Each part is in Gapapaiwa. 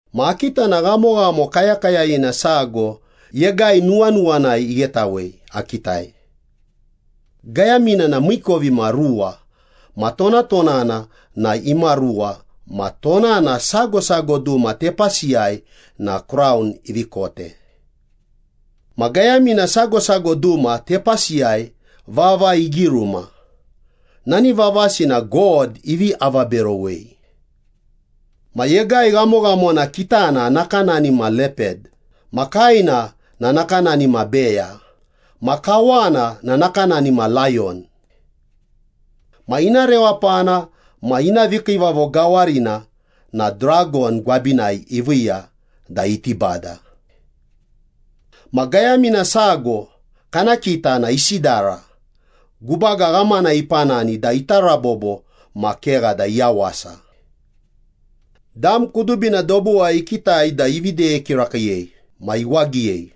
Ma akita na ghamoghamo kayakayayina sago yegai nuwanuwanai ighetawei akitai. Gayamina na miikovimaruwa ma tonatonana na imaruwa ma tonana sago sago duma tepasiyai na kraun ivi kote. Ma gayamina sago sago duma tepasiyai vava igiruma, nani vavasi na God ivi avaberowei. Ma yegai ghamoghamona kitana nakanani ma lepad ma kaena na nakanani ma beya ma kawana na nakanani ma layon. Ma ina rewapana ma ina vikiivavo gawarina na dragon gwabinai iviiya da iti bada. Ma gayamina sago kana kita na isidara, gubaga ghamana ipanani da ita rabobo ma kegha da iyawasa. Dam kudubina dobuwai ikitai da ivi deye kirakiiyei ma iwagiyei.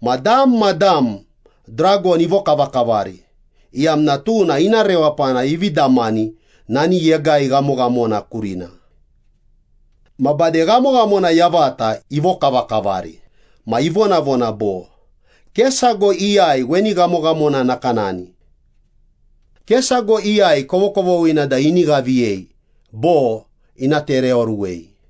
Ma dam ma dam dragon ivokavakavari, iyamna tuna ina rewapana ivi damani nani yegai ghamoghamona kurina. Ma bade ghamoghamona yavata ivokavakavari ma ivonavona bo, “Ke sago iyai weni ghamoghamona nakanani. Ke sago iyai kovokovoghina da ini ghaviyei bo ina tereoruwei.”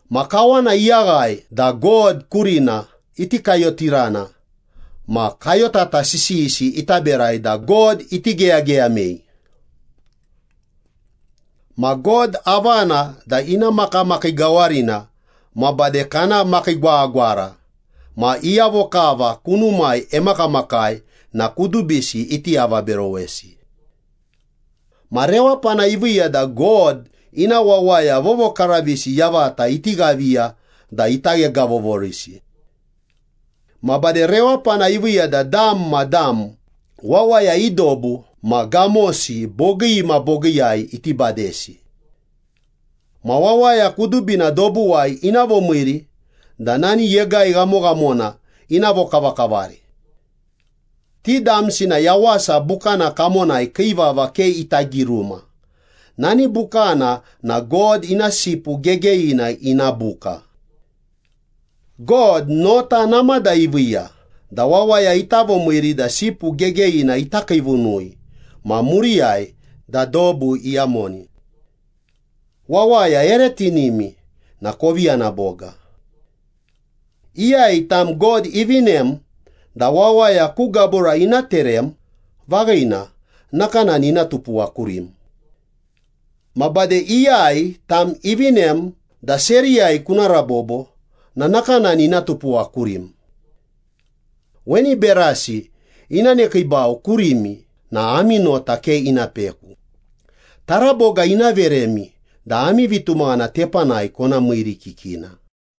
Ma kawana iyaghae da God kurina iti kayotirana ma kayotata sisiyisi ita berai da God iti geyageyamei. Ma God avana da ina makamakii gawarina ma bade kana makiigwagwagwara ma iyavo kava kunumai emakamakai na kudubisi iti avaberowesi. Ma rewapana iviiya da God ina wawaya vovokaravisi yavata iti ghaviya da ita ghegavovorisi. Ma bade rewapana iviiya da dam ma dam, wawaya i dobu ma gamosi bogii ma bogiiyai iti badesi. Ma wawaya kudubina dobuwai ina vomiiri da nani yegai ghamoghamona ina vokavakavari. Ti damsi na Yawasa Bukana kamonai kii vava ke ita giruma, nani bukana na God ina Sipu Gegeyina ina buka. God nota namada iviiya da wawaya ita vomiiri da Sipu Gegeyina ita kiivunui ma muriyai da dobu iyamoni. “Wawaya ere tinimi na kovi yana boga. Iyai tam God ivinem da wawaya ku gabura ina terem, vaghina, nakanani ina tupuwa kurim. Ma bade iyai tam ivinem da seriyai kuna rabobo na nakanani ina tupuwa kurim. Weni berasi ina nekiibau kurimi na ami nota ke ina peku, taraboga ina veremi da ami vitumaghana tepanai kona miirikikina.”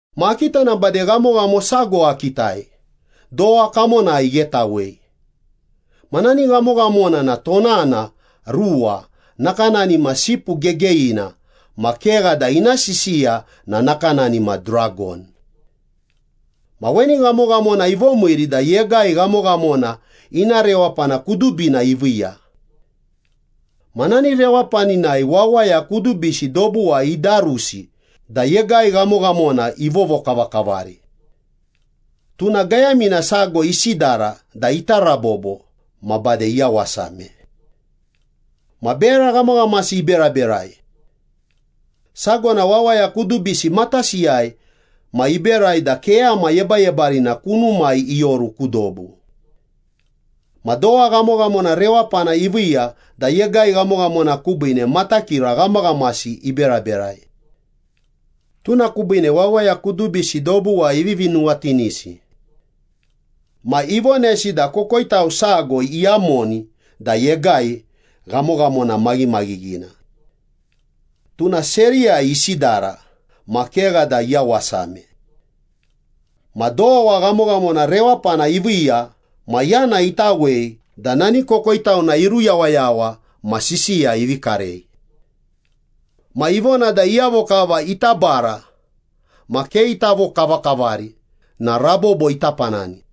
Ma akita na bade ghamoghamo sago akitai, dowa kamonai ighetawei. Ma nani ghamoghamona na tonana ruwa, nakanani ma sipu gegeyina ma kegha da ina sisiya na nakanani ma dragon. Ma weni ghamoghamona ivomiiri da yegai ghamoghamona ina rewapana kudubina iviiya. Ma nani rewapaninai wawaya kudubisi dobuwai idarusi da yegai ghamoghamona ivovokavakavari. Tuna gayamina sago isidara da ita rabobo ma bade iyawasame. Ma bera ghamaghamasi iberaberai. Sago na wawaya kudubisi matasiyai ma iberai da keyama yebayebarina kunumai ioru ku dobu. Ma dowa ghamoghamona rewapana iviiya da yegai ghamoghamona kubiine matakira ghamaghamasi iberaberai. Tuna kubiine wawaya kudubisi dobuwai ivivi nuwatinisi. Ma ivonesi da kokoitau sago iyamoni da yegai ghamoghamona maghimaghighina. Tuna seriyai isidara ma kegha da iyawasame. Ma dowa ghamoghamona rewapana iviiya ma yana itawei da nani kokoitauna iruyawayawa ma sisiya ivi karei. Ma ivona da iyavo kava ita bara ma ke ita vokavakavari na rabobo ita panani.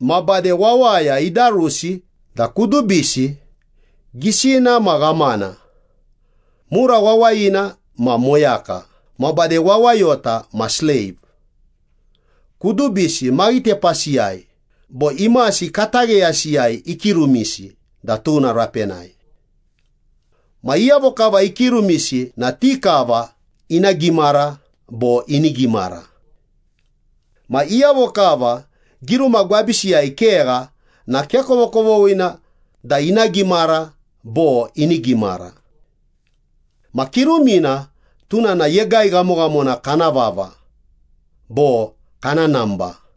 Ma bade wawaya idarusi da kudubisi, gisina ma ghamana, mura wawayina ma moyaka ma bade wawayota ma sleiv, kudubisi maghitepasiyai bo imasi katagheyasiyai ikirumisi da tuna rapenai. Ma iyavo kava ikirumisi na ti kava ina gimara bo ini gimara. Ma iyavo kava kiruma gwabisiyai kegha na ke kovokovoghina da ina gimara bo ini gimara. Ma kirumina tuna na yegai ghamoghamona kana vava bo kana namba.